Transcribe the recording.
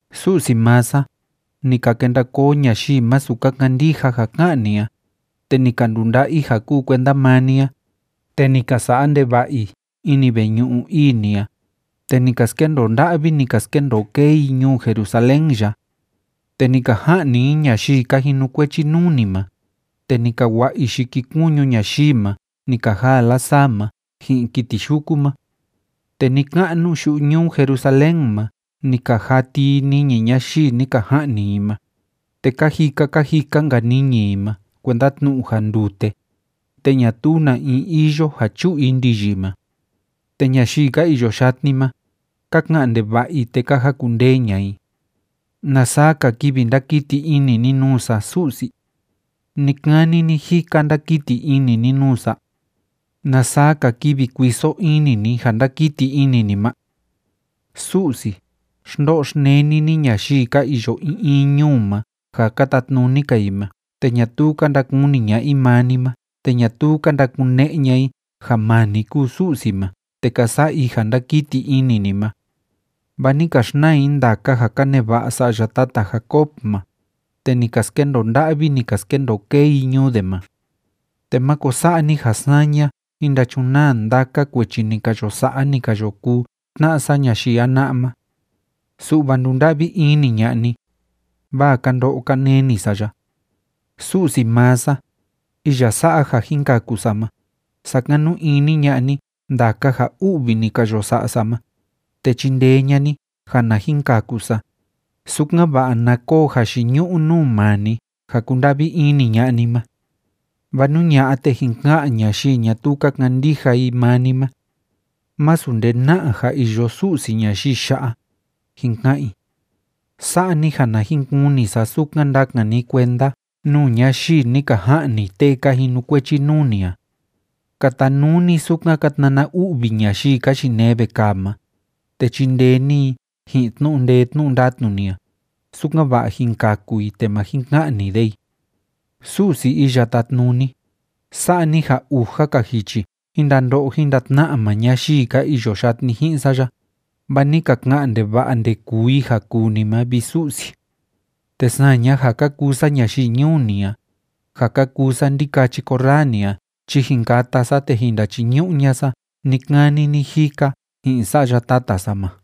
Su'si maa sa, ni ka kenda koo ñayii masu ka kandija ja ká'an ni a, te ni ka ndunda'a i ja kúu kuenda maa ni a, te ni ka sa'a ndeva'a i ini veñu'u ii ni a, te ni ka skendoo nda'vi, ni ka skendoo kee i ñuu Jerusalén ya. Te ni ka ja'ni i ñayii ka jinukuechi nuu ni ma, te ni ka wa'a i yikikuñu ñayii ma ni ka jaa lasaa ma ji'in kiti yuku ma. Te ni‑ka'nu yu'u ñuu Jerusalén ma ni ka jati i niñi ñayii ni ka ja'ni i ma, te ka jika ka jika‑nka niñi i ma kuenda tnu'u ja ndute, te ñatuu na in iyo ja chu'u i ndiyi ma. Te ñayii ka iyo yatni ma, ka ka'an ndeva'a i, te ka jakundee ña'a i. ¿Na saa‑ka kivi ndakiti ini ni nuu sa, Su'si? ¿Ni‑kani ni‑jika ndakiti ini ni nuu sa? ¿Na saa‑ka kivi kuiso ini ni ja ndákiti ini ni ma? Su'si, xndo'o xneni ni ñayii ka iyo in in ñuu ma ja ka tatnuni‑ka i ma te ñatuu ka ndakuni ña'a i maa ni ma te ñatuu ka ndakune'e ña'a i ja maa ni kúu Su'si ma te ka sa'a i ja ndákiti ini ni ma. Vaa ni ka xnaa i ndaka ja ka neva'a sa'ya tata Jacob ma, te ni ka skendoo nda'vi, ni ka skendoo kee i ñuu de ma. Te máko sa'a ni ja saña jin ndachunaa ndaka kuechi ni ka yo sa'a, ni ka yo kuu tna'a sa ñayii jana'a ma. Su'va ndunda'vi ini ña'a ni, vaa ka ndo'o ka neni sa ya. Su'si maa sa, iya sa'a ja jin kaku sa ma, sakanu ini ña'a ni ndaka ja u'vi ni ka yo sa'a sa ma, te chindee ña'a ni ja na jin kaku sa, sukan‑va'a na koo jayiñu'u nuu maa ni ja kúnda'vi ini ña'a ni ma. Vaa nú ña'a, te jin ka'an ñayii ñatuu ka kandija i maa ni ma: “Másu nde na'a ja iyo Su'si ñayii ya'a”, jin ka'an i. Sa'a ni ja na jin kuni sa sukan ndakan ni kuenda nuu ñayii ni ka ja'ni tee ka jinukuechi nuu ni a. Katanuu ni sukan ka tnana u'vi ñayii ka yinee vekaa ma, te chindee ni i ji'in tnu'u ndee tnu'u ndatnu ni a, sukan‑va'a jin kaku i te má jin ka'ni de i. Su'si Iya Tátnuni, sa'a ni ja uja‑ka jichi jin ndando'o jin ndatna'a maa ñayii ka iyo yatni ji'in sa ya, vaa ni ka ka'an ndeva'a ndekuu i ja kuu ni ma, vi Su'si. Te saña ja ka kuu sa ñayii ñuu ni a, ja ka kuu sa ndikachi korraa ni a chi jin kata sa te jin ndachiñu'u ña'a sa ni‑kani ni‑jika ji'in sa'ya tata sa ma.